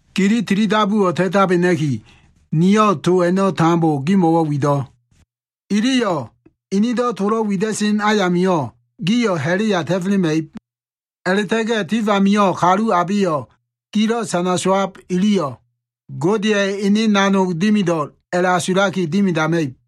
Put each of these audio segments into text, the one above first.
“Gili tili dabuwo꞉ ta꞉tabena꞉ki, niyo꞉ to a꞉no꞉ tambo gimo꞉wo꞉ wido꞉. Iliyo꞉ inido꞉ tolo꞉ wida꞉sen ayamio꞉ gio꞉ ha꞉la꞉ya ta꞉felema꞉ib. A꞉la꞉ta꞉ga꞉ tif amio꞉ kalu abeyo꞉ gilo꞉ sana sowab iliyo꞉ Godeya꞉ ene nanog dimido꞉l a꞉la꞉asulaki dimidama꞉ib.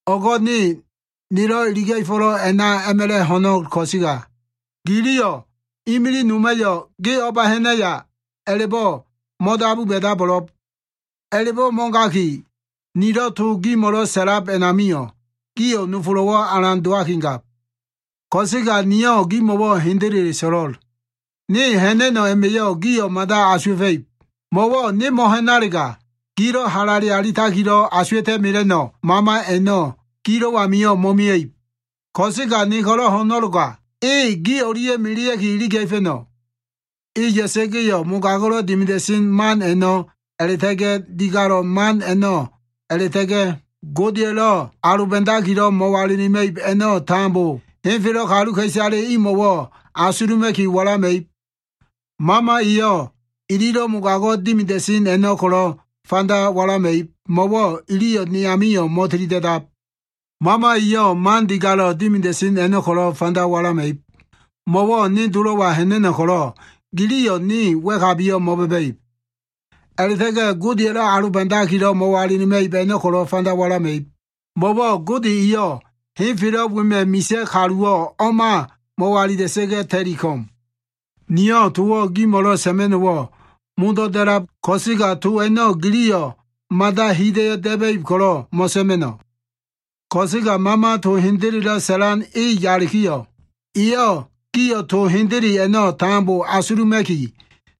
O꞉go꞉ ne nelo꞉ iliga꞉fo꞉lo꞉ a꞉na a꞉ma꞉la꞉ ho꞉no꞉l ko꞉sega, giliyo꞉ imilig noma꞉yo꞉ ‘Ge o꞉ba ha꞉naya?’ a꞉la꞉bo꞉ mo꞉dabu ba꞉dabo꞉lo꞉b. A꞉la꞉bo꞉ mo꞉gaki, nilo꞉ to gimo꞉lo꞉ sa꞉lab a꞉namio꞉, gio꞉ nofolo꞉wo꞉ alan dowakigab. Ko꞉sega niyo꞉ gimo꞉wo꞉ hendele so꞉lo꞉l. Ne ha꞉na꞉no꞉ a꞉ma꞉yo꞉ gio꞉ mada asuwa꞉fa꞉ib. Mo꞉wo꞉ ne mo꞉ha꞉nalega, gilo꞉ halale alitakilo꞉ asuwa꞉ta꞉ mela꞉no꞉ Mama a꞉no꞉ gilo꞉ amio꞉ mo꞉mia꞉ib. Ko꞉sega ne ko꞉lo꞉ ho꞉no꞉loga, e gi o꞉lia꞉ melea꞉ki iliga꞉fa꞉no꞉. E ya꞉sa꞉ga꞉yo꞉, mogago꞉lo꞉ dimida꞉sen man a꞉no꞉, a꞉la꞉ta꞉ga꞉ digalo꞉ man a꞉no꞉, a꞉la꞉ta꞉ga꞉ Godeya꞉lo꞉ aloba꞉dakilo꞉ mo꞉walilima꞉ib a꞉no꞉ tambo henfelo꞉ kaluka꞉isale imo꞉wo꞉ asuluma꞉ki walama꞉ib. Mama eyo꞉ ililo꞉ mogago꞉ dimida꞉sen a꞉no꞉ ko꞉lo꞉ fanda walama꞉ib, mo꞉wo꞉ iliyo꞉ ne amio꞉ mo꞉tilida꞉dab. Mama eyo꞉ man digalo꞉ dimida꞉sen a꞉no꞉ ko꞉lo꞉ fanda walama꞉ib, mo꞉wo꞉ ne Dolo꞉wa ha꞉na꞉no꞉ ko꞉lo꞉ giliyo꞉ ne wa꞉kabiyo꞉ mo꞉ba꞉ba꞉ib. A꞉la꞉ta꞉ga꞉ Godeya꞉lo꞉ aloba꞉dakilo꞉ mo꞉walilima꞉ib a꞉no꞉ ko꞉lo꞉ fanda walama꞉ib, mo꞉wo꞉ Gode eyo꞉ henfelo꞉ wema꞉ misa꞉ kaluwo꞉ o꞉ma mo꞉walila꞉sa꞉ga꞉ ta꞉li ko꞉m. “Niyo꞉ towo꞉ gimo꞉lo꞉ sa꞉ma꞉no꞉wo꞉ modo꞉ da꞉lab ko꞉sega, to a꞉no꞉ giliyo꞉ mada hida꞉yo꞉ da꞉ba꞉ib ko꞉lo꞉ mo꞉sa꞉ma꞉no꞉. Ko꞉sega Mama to hendelelo꞉ sa꞉lan e yalikiyo꞉, eyo꞉ gio꞉ to hendele a꞉no꞉ tambo asuluma꞉ki,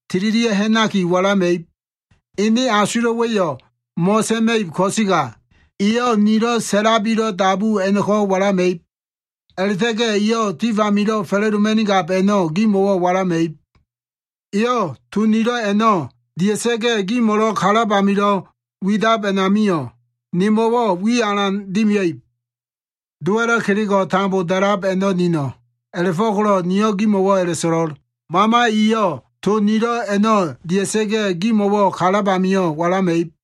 tililia꞉ ha꞉nakiyo꞉ walama꞉ib. Ene asulo꞉wa꞉yo꞉ mo꞉sa꞉ma꞉ib ko꞉sega, eyo꞉ nilo꞉ sa꞉labilo꞉ dabu a꞉no꞉ko꞉ walama꞉ib. A꞉la꞉ta꞉ga꞉ eyo꞉ tif amilo꞉ fa꞉la꞉doma꞉nigab a꞉no꞉ gimo꞉wo꞉ walama꞉ib. Eyo꞉ to nilo꞉ a꞉no꞉ dia꞉sa꞉ga꞉, gimo꞉lo꞉ kalab amilo꞉ widab a꞉namio꞉, nemo꞉wo꞉ wiyo꞉ alan dimia꞉ib. Dowa꞉lo꞉ kelego꞉ tambo da꞉lab a꞉no꞉ nino꞉. A꞉la꞉fo꞉ko꞉lo꞉ niyo꞉ gimo꞉wo꞉ a꞉la꞉so꞉lo꞉l, Mama eyo꞉ to nilo꞉ a꞉no꞉ dia꞉sa꞉ga꞉, gimo꞉wo꞉ kalab amio꞉ walama꞉ib.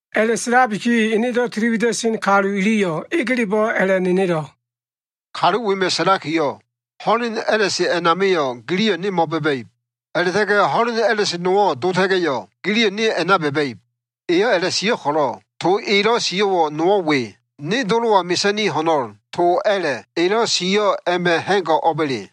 A꞉la꞉sa꞉labiki enedo꞉ tiliwida꞉sen kalu iliyo꞉ egelebo꞉ a꞉la꞉nenelo꞉, “Kalu wema꞉ sa꞉lakiyo꞉, ‘Ho꞉len a꞉la꞉se a꞉namio꞉, giliyo꞉ ne mo꞉ba꞉ba꞉ib. A꞉la꞉ta꞉ga꞉ ho꞉len a꞉la꞉se nowo꞉ dota꞉ga꞉yo꞉, giliyo꞉ ne a꞉na ba꞉ba꞉ib’ Eyo꞉ a꞉la꞉sio꞉ ko꞉lo꞉ to elo꞉ sio꞉wo꞉ nowo꞉ we, ‘ne Dolo꞉wa mesa꞉ni ho꞉no꞉l’ to a꞉la꞉ elo꞉ sio꞉ a꞉ma꞉ ha꞉go꞉ o꞉ba꞉le?”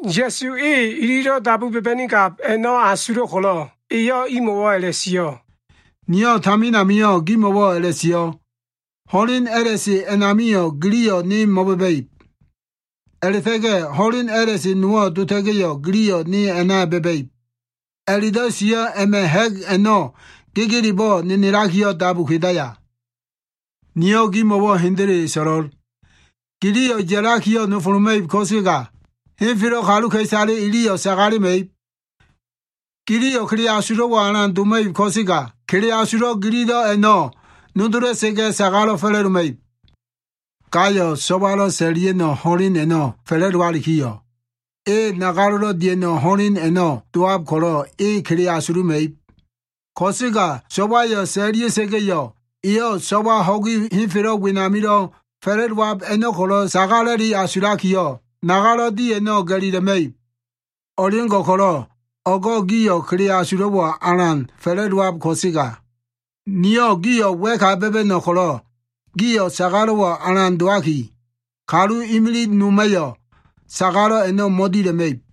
Ya꞉su e ililo꞉ dabu ba꞉ba꞉nigab a꞉no꞉ asulo꞉ ko꞉lo꞉, eyo꞉ imo꞉wo꞉ a꞉la꞉sio꞉, “Niyo꞉ tamin amio꞉ gimo꞉wo꞉ a꞉la꞉sio꞉, ‘Ho꞉len a꞉la꞉se a꞉namio꞉, giliyo꞉ ne mo꞉ba꞉ba꞉ib.’ A꞉la꞉ta꞉ga꞉ ‘ho꞉len a꞉la꞉se nowo꞉ dota꞉ga꞉yo꞉, giliyo꞉ ne a꞉na ba꞉ba꞉ib’ a꞉la꞉do꞉ sio꞉ a꞉ma꞉ ha꞉g a꞉no꞉ gegelebo꞉ nenelakiyo꞉ dabu kedaya? Niyo꞉ gimo꞉wo꞉ hendele so꞉lo꞉l. Giliyo꞉ ya꞉lakiyo꞉ nofoloma꞉ib ko꞉sega, henfelo꞉ kaluka꞉isale iliyo꞉ sagalema꞉ib. Giliyo꞉ kele asulo꞉wo꞉ alan doma꞉ib ko꞉sega, kele asulo꞉ gililo꞉ a꞉no꞉ nodola꞉sa꞉ga꞉ sagalo꞉ fa꞉la꞉doma꞉ib. Gayo꞉ so꞉walo꞉ sa꞉la꞉lia꞉no꞉ ho꞉len a꞉no꞉ fa꞉la꞉dowalikiyo꞉, e nagalo꞉lo꞉ dia꞉no꞉ ho꞉len a꞉no꞉ dowab ko꞉lo꞉, e kele asuluma꞉ib. Ko꞉sega so꞉wayo꞉ sa꞉la꞉lia꞉sa꞉ga꞉yo꞉, eyo꞉ so꞉wa ho꞉gi henfelo꞉ wenamilo꞉ fa꞉la꞉dowab a꞉no꞉ ko꞉lo꞉ sagala꞉li asulakiyo꞉, nagalo꞉ di a꞉no꞉ ga꞉lila꞉ma꞉ib. O꞉leo꞉ngo꞉ ko꞉lo꞉ o꞉go꞉ gio꞉ kele asulo꞉wo꞉ alan fa꞉la꞉dowab ko꞉sega, niyo꞉ gio꞉ wa꞉ka ba꞉ba꞉no꞉ ko꞉lo꞉ gio꞉ sagalo꞉wo꞉ alan dowaki, kalu imilig noma꞉yo꞉ sagalo꞉ a꞉no꞉ mo꞉dila꞉ma꞉ib.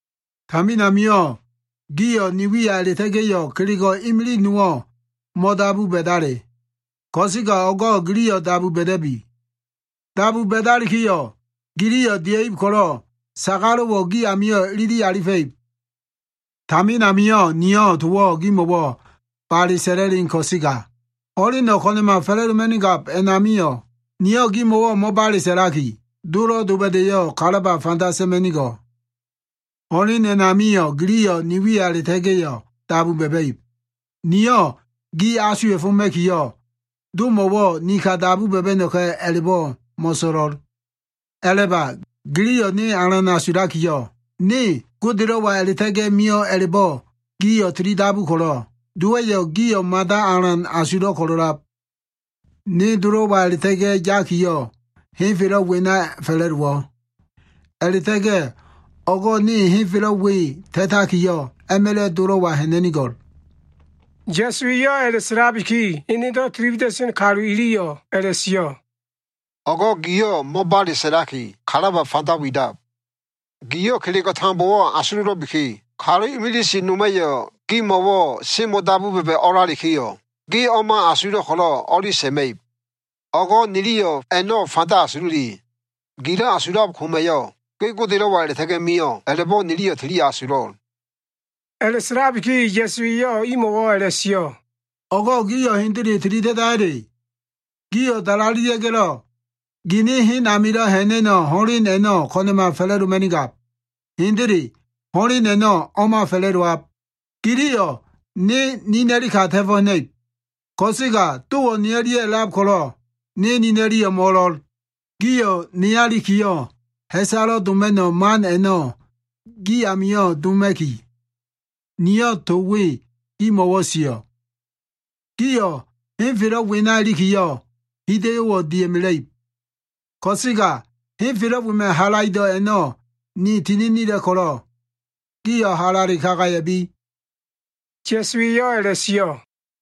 Tamin amio꞉ gio꞉ ni wiya a꞉la꞉ta꞉ga꞉yo꞉ kelego꞉ imilig nowo꞉ mo꞉dabu ba꞉dale. Ko꞉sega o꞉go꞉ giliyo꞉ dabu ba꞉da꞉bi. Dabu ba꞉dalikiyo꞉, giliyo꞉ dia꞉ib ko꞉lo꞉ sagalo꞉wo꞉ gi amio꞉ ilili alifa꞉ib. “Tamin amio꞉ niyo꞉ towo꞉ gimo꞉wo꞉ bale sa꞉la꞉len ko꞉sega, ho꞉leno꞉ ko꞉na꞉ma fa꞉la꞉doma꞉nigab a꞉namio꞉ niyo꞉ gimo꞉wo꞉ mo꞉bale sa꞉laki, Dolo꞉ doba꞉da꞉yo꞉ kalaba fanda sa꞉ma꞉nigo꞉l. Ho꞉len a꞉namio꞉ giliyo꞉ ni wiya a꞉la꞉ta꞉ga꞉yo꞉ dabu ba꞉ba꞉ib. Niyo꞉ gio꞉ asuwa꞉foma꞉kiyo꞉, Domo꞉wo꞉ ni ka dabu ba꞉ba꞉no꞉ka꞉ a꞉la꞉bo꞉ mo꞉so꞉lo꞉l. A꞉la꞉ba. Giliyo꞉ ne alan asulakiyo꞉, ne Godelo꞉wa a꞉la꞉ta꞉ga꞉ mio꞉ a꞉la꞉bo꞉ gio꞉ tilidabu ko꞉lo꞉, Dowa꞉yo꞉ gio꞉ mada alan asulo꞉ ko꞉lo꞉lab. Ne Dolo꞉wa a꞉la꞉ta꞉ga꞉ yakiyo꞉ henfelo꞉ wena fa꞉la꞉dowo꞉. A꞉la꞉ta꞉ga꞉ o꞉go꞉ ne henfelo꞉ we ta꞉takiyo꞉, a꞉ma꞉la꞉ Dolo꞉wa ha꞉na꞉nigo꞉l.” Ya꞉su eyo꞉ a꞉la꞉sa꞉labiki, enedo꞉ tili wida꞉sen kalu iliyo꞉ a꞉la꞉sio꞉, “O꞉go꞉ giyo꞉ mo꞉bale sa꞉laki, kalaba fanda widab. Giyo꞉ kelego꞉ tambowo꞉ asulo꞉lo꞉biki, kalu imilig noma꞉yo꞉ gimo꞉wo꞉ semo꞉ dabu ba꞉ba꞉ o꞉lalikiyo꞉, ge o꞉ma asulo꞉ ko꞉lo꞉ o꞉li sa꞉ma꞉ib. O꞉go꞉ niliyo꞉ a꞉no꞉ fanda asululi. Gilo꞉ asulab koma꞉yo꞉, ge Godelo꞉wa a꞉la꞉ta꞉ga꞉ mio꞉ a꞉la꞉bo꞉ niliyo꞉ tili asulo꞉l.” A꞉la꞉sa꞉labiki Ya꞉su eyo꞉ imo꞉wo꞉ a꞉la꞉sio꞉, “O꞉go꞉ gio꞉ hendele tili da꞉daya꞉le? Gio꞉ dalalelia꞉ga꞉lo꞉, gini hen amilo꞉ ha꞉na꞉no꞉ ho꞉len a꞉no꞉ ko꞉na꞉ma fa꞉la꞉doma꞉nigab. Hendele ho꞉len a꞉no꞉ o꞉ma fa꞉la꞉dowab. Giliyo꞉ ne nina꞉li ka ta꞉fo꞉ ha꞉na꞉ib. Ko꞉sega Dowo꞉ ne o꞉lia꞉ a꞉lab ko꞉lo꞉ ne nina꞉liyo꞉ mo꞉o꞉lo꞉l. Gio꞉ neya ilikiyo꞉, ha꞉salo꞉ doma꞉no꞉ man a꞉no꞉ gi amio꞉ doma꞉ki, niyo꞉ to we gimo꞉wo꞉ sio꞉. Gio꞉ henfelo꞉ wena ilikiyo꞉, hida꞉yo꞉wo꞉ dia꞉mela꞉ib. Ko꞉sega henfelo꞉ wema꞉ halaido꞉ a꞉no꞉ ni tininila꞉ ko꞉lo꞉, gio꞉ halale kagaya꞉bi.” Ya꞉su eyo꞉ a꞉la꞉sio꞉.